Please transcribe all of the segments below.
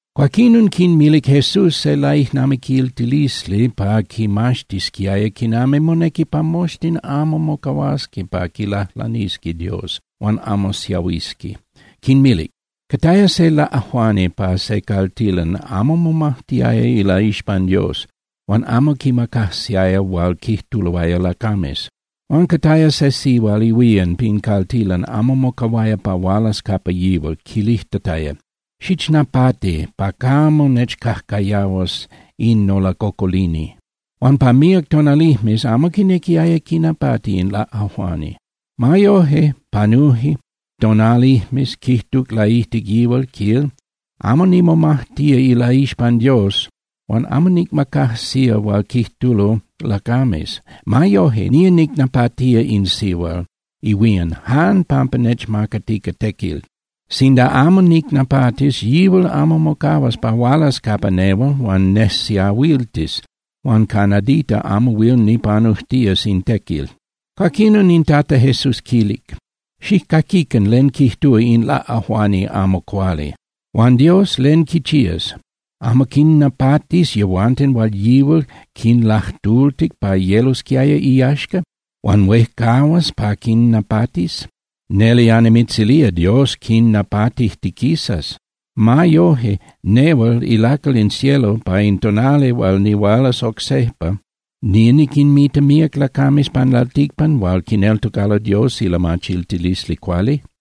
Cuaquinon quinmilic Jesús se laijnamiquiltilisli pa quinmaxtisquiaya quinami monequi pa moxtin amo mocahuasqui pa quilajlanisqui Dios huan amo siahuisqui, quinmilic: —Cataya se laꞌajuani pa se caltilan amo momajtiaya ilaixpan Dios, huan amo quimacajsiaya hual quijtuloaya lacames. Huan cataya se sihual ihuían pin caltilan amo mocahuaya pa hualas capa yihual, quilijtataya: “Xichnapati pa camo nechcajcayahuas in nolacocolini.” Huan pa míac tonalijmes amo quinequiaya quinapati in laꞌajuani. Ma yoje, panuje tonalijmes, quijtuc laijtic yihual, quil: “Amo nimomajtía ilaixpan Dios, huan amo nicmacajsía hual quijtulo lacames. Ma yoje, nía nicnapatía in sihual ihuían jan pampa nechmacatica tequil. Sinda amo nicnapatis, yihual amo mocahuas pa hualas capa nehual huan nejsiahuiltis huan ca nadita amo huil nipanujtías in tequil.” Cuaquinon in Tata Jesús quilic: —Xijcaquican len quijtúa in laꞌajuani amo cuali. Huan Dios, ¿len quichías? ¿Amo quinnapatis yehuanten hual yihual quinlajtultic pa yelosquiaya iyaxca? Huan ¿huejcahuas pa quinnapatis? Neli annimitzilía, Dios quinnapatijtiquisas. Ma yoje, nehual ilacal in cielo, pa in tonali hual nihualas oc sejpa, ¿nía niquinmita míac lacames pan lalticpan hual quineltocalo Dios ilamachiltilisli cuali?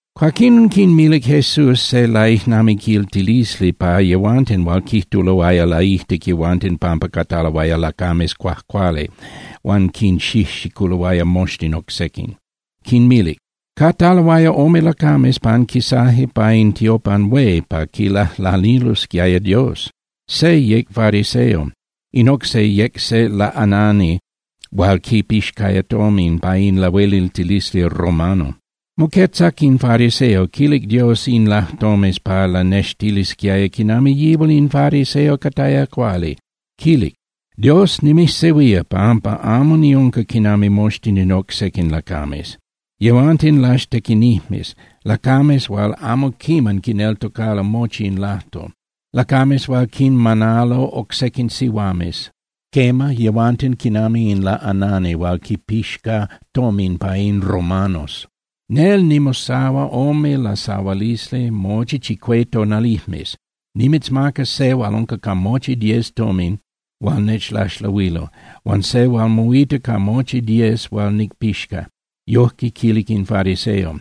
Cuaquinon quinmilic Jesús se laijnamiquiltilisli pa yehuanten hual quijtuloaya laijtic yehuanten pampa cataloaya lacames cuajcuali huan quinxijxiculoaya moxtin oc sequin. Quinmilic: —Cataloaya ome lacames panquisaje pa in tiopan hué pa quilajlanilosquiaya Dios. Se yec fariseo, in oc se yec se laꞌanani hual quipixcaya tomin pa in lahueliltilisli romano. Moquetzac in fariseo, quilic Dios in lajtomes pa lanextilisquiaya quinami yihual in fariseo cataya cuali, quilic: “Dios, nimijsehuía pampa amo niunca quinami moxtin in oc sequin lacames. Yehuanten laxtequinijmes, lacames hual amo quiman quineltocalo mochi in lajtol, lacames hual quinmanalo oc sequin sihuames. Quema, yehuanten quinami in laꞌanani hual quipixca tomin pa in romanos. Nel nimosahua ome lasahualisli mochi chicué tonalijmes, nimitzmaca se hual unca ca mochi diez tomin hual nechlaxlahuilo huan se hual moita ca mochi diez hual nicpixca.” Yoje quilic in fariseo.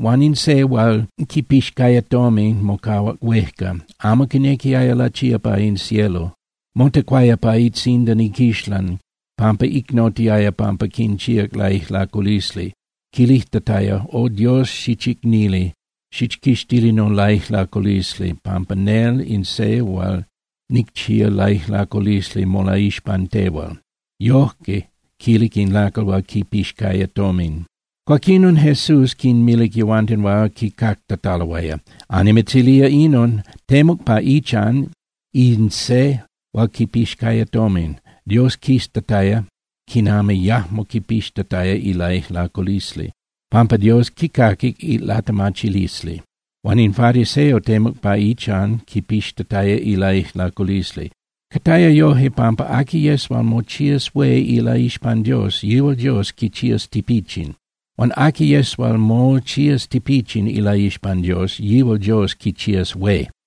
Huan in se hual quipixcaya tomin mocahuac huejca, amo quinequiaya lachía pa in cielo. Motecuaya pa itzindan iquixlan pampa icnotiaya pampa quinchíac laijlaculisli, quilijtataya: “O Dios, xichicnili, xichquixtili nolaijlaculisli pampa nel in se hual nicchía laijlaculisli molaixpan tehual.” Yoje quilic in lacal hual quipixcaya tomin. Cuaquinon Jesús quinmilic yehuanten hual quicactataloaya: —Annimitzilía inon. Temuc pa ichan in se hual quipixcaya tomin, Dios quiztataya quinami yajmo quipixtataya ilaijlaculisli, pampa Dios quicaquic ilatemachilisli. Huan in fariseo temuc pa ichan quipixtataya ilaijlaculisli. Cataya yoje pampa aqui yes hual mochías hué ilaixpan Dios, yihual Dios quichías tipichin. Huan aqui yes hual mochías tipichin ilaixpan Dios, yihual Dios quichías hué.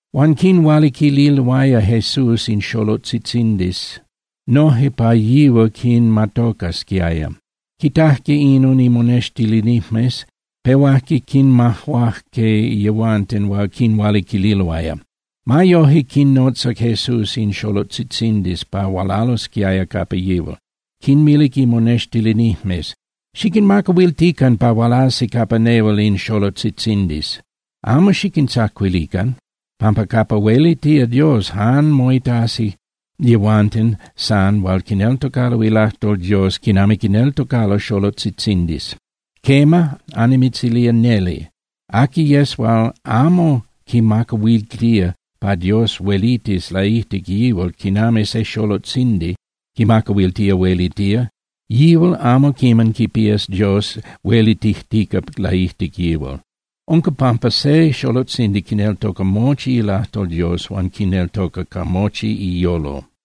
Huan quinhualiquililoaya Jesús in xolotzitzindis noje pa yihual quinmatocasquiaya. Quitajque inon imonextilinijmes, pehuajque quinmajuajque yehuanten hual quinhualiquililoaya. Ma yoje, quinnotzac Jesús in xolotzitzindis pa hualalosquiaya capa yihual, quinmilic imonextilinijmes: —Xiquinmacahuiltican pa hualasi capa nehual in xolotzitzindis. Amo xiquintzacuilican, pampa capa huelitía Dios jan moitasi yehuanten san hual quineltocalo ilajtol Dios quinami quineltocalo xolotzitzindis. Quema, annimitzilía neli, aqui yes hual amo quimacahuiltía pa Dios huelitis laijtic yihual quinami se xolotzindi quimacahuiltía huelitía, yihual amo quiman quipías Dios huelitijtica laijtic yihual. Unca pampa se xolotzindi quineltoca mochi ilajtol Dios huan quineltoca ca mochi iyolo.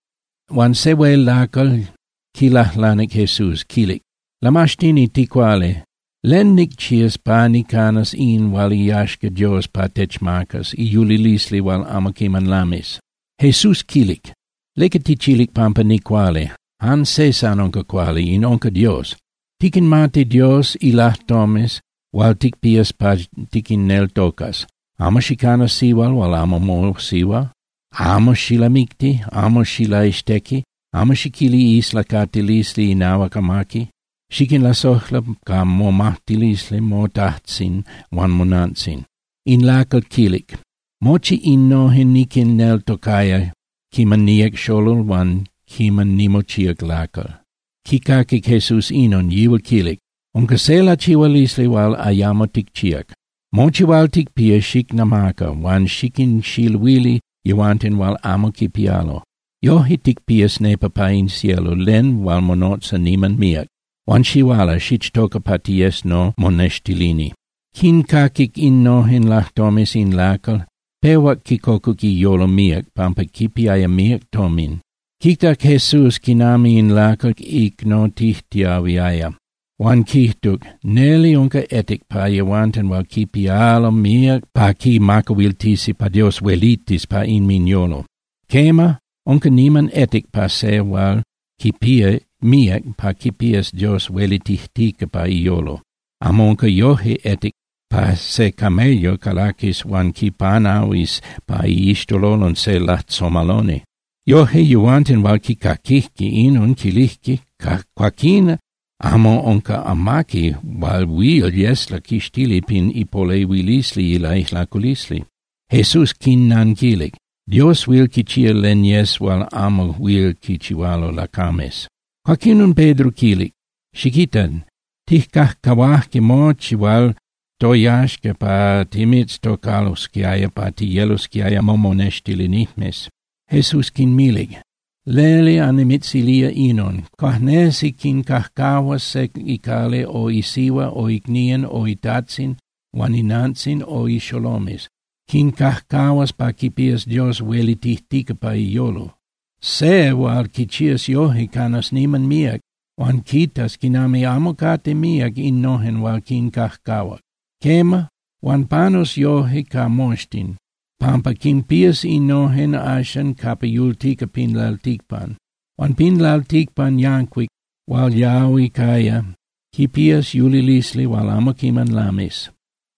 Huan se hué hual yec lacal yancuic quilajlanic Jesús, quilic: —Lamaxtini ticuali, ¿len nicchías pa nicanas in hual iyaxca Dios pa techmacas, iyulilisli hual amo quiman lamis? Jesús quilic: —¿Leca tichilic pampa nicuali? Jan se san unca cuali, in unca Dios. Tiquinmati Dios ilajtomes hual ticpías pa tiquinneltocas: Amo xicana sihual hual amo mosihua, amo xilamicti, amo xilaixtequi, amo xiquili islacatilisli inahuac amaqui, xiquinlasojla ca momajtilisli motajtzin huan monantzin. In lacal yancuic quilic: —Mochi innojen niquinneltocaya quiman niyec xolol huan quiman nimochíac lacal. Quicaquic Jesús inon, yihual quilic: —Unca se lachihualisli hual ayamo ticchíac. Mochi hual ticpía xicnamaca huan xiquinxiluili yehuanten hual amo quipialo. Yoje ticpías nepa pa in cielo len hual monotza niman míac. Huan xihuala, xichtoca pa tiyes nomonextilini. Quincaquic innojen lajtomes in lacal yancuic, pehuac quicocuc iyolo míac, pampa quipiaya míac tomin. Quitac Jesús quinami in lacal yancuic icnotijtiahuiaya, huan quijtuc: —¡Neli unca etic pa yehuanten hual quipialo míac pa quimacahuiltisi pa Dios huelitis pa inminyolo! Quema, unca niman etic pa se hual quipía míac pa quipías Dios huelitijtica pa iyolo. Amo unca yoje etic pa se camello calaquis huan quipanahuis pa iixtololon se lajtzomaloni. Yoje yehuanten hual quicaquijque inon quilijque: —Cuaquín amo unca amaqui hual huil yes laquixtili pin ipolehuilisli ilaijlaculisli. Jesús quinnanquilic: —Dios huil quichía len yes hual amo huil quichihualo lacames. Cuaquinon Pedro quilic: —Xiquita. Tijcajcahuaje mochi hual toyaxca pa timitztocalosquiaya pa tiyelosquiaya momonextilinijmes. Jesús quinmilic: —Neli annimitzilía inon: Cuajnesi quincajcahuas se icali o isihua o icnían o itajtzin huan inantzin o ixolomes. Quincajcahuas pa quipías Dios huelitijtica pa iyolo. Se hual quichías yoje canas niman míac, huan quitas quinami amo cate míac innojen hual quincajcahuac. Quema, huan panus yoje ca moxtin, pampa quinpías innojen axan capa yultica pin lalticpan. Huan pin lalticpan yancuic hual yahui caya, quipías yulilisli hual amo quiman lamis.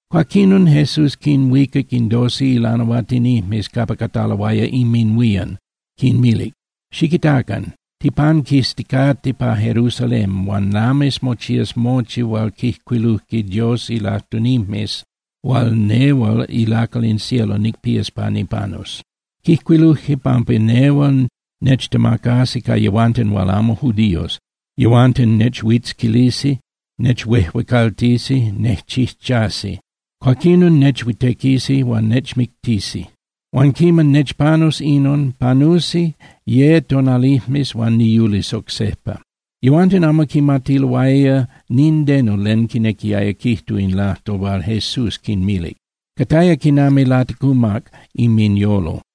Cuaquinon Jesús quinhuicac in doce ilanahuatinijmes capa cataloaya inminhuían, quinmilic: —Xiquitacan. Tipanquisticate pa Jerusalén huan lamis mochías mochi hual quijcuiluje Dios ilajtunijmes hual nehual ilacal in cielo nicpías pa nipanus. Quijcuiluje pampa nehual nechtemacasi ca yehuanten hual amo judíos. Yehuanten nechuitzquilisi, nechuejuecaltisi, nejchijchasi. Cuaquinon nechuitequisi huan nechmictisi. Huan quiman nechpanus inon, panusi ye tonalijmes huan niyulis oc sejpa. Yehuanten amo quimatiloaya nindeno len quinequiaya quijtu in lajtol hual Jesús quinmilic. Cataya quinami laticumac inminyolo.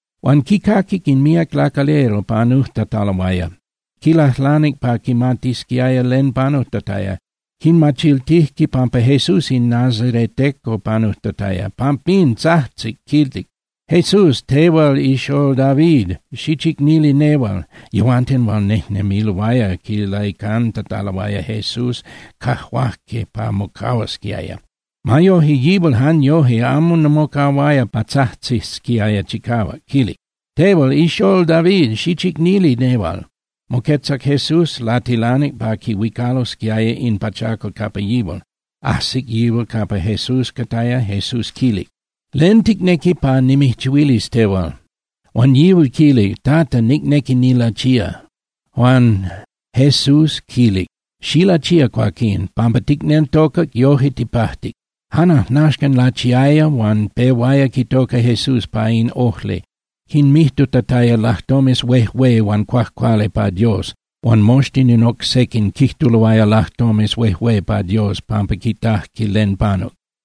Huan quicaquic in míac lacalera panujtataloaya, quilajlanic pa quimatisquiaya len panujtataya. Quimachiltijque pampa Jesús in nazareteco panujtataya. Pampín tzajtzic, quilic: —¡Jesús, tehual ixól David, xichicnili nehual! Yehuanten hual nejnemiloaya quilaicantataloaya Jesús cajuajque pa mocahuasquiaya. Ma yoje, yihual jan yoje amo mocahuaya pa tzajtzisquiaya chicahuac, quilic: —¡Tehual ixól David, xichicnili nehual! Moquetzac Jesús, latilanic pa quihuicalosquiaya in pachacal capa yihual. Ajsic yihual capa Jesús cataya, Jesús quilic: —¿Len ticnequi pa nimijchihuilis tehual? Huan yihual quilic: —Tata, nicnequi nilachía. Huan Jesús quilic: —¡Xilachía, cuaquín! Pampa ticneltocac, yoje tipajtic. Jan ajnaxcan lachiaya huan pehuaya quitoca Jesús pa in ojli, quinmijtutataya lajtomes huejué huan cuajcuali pa Dios. Huan moxtin in oc sequin quijtuloaya lajtomes huejué pa Dios pampa quitajque len panuc.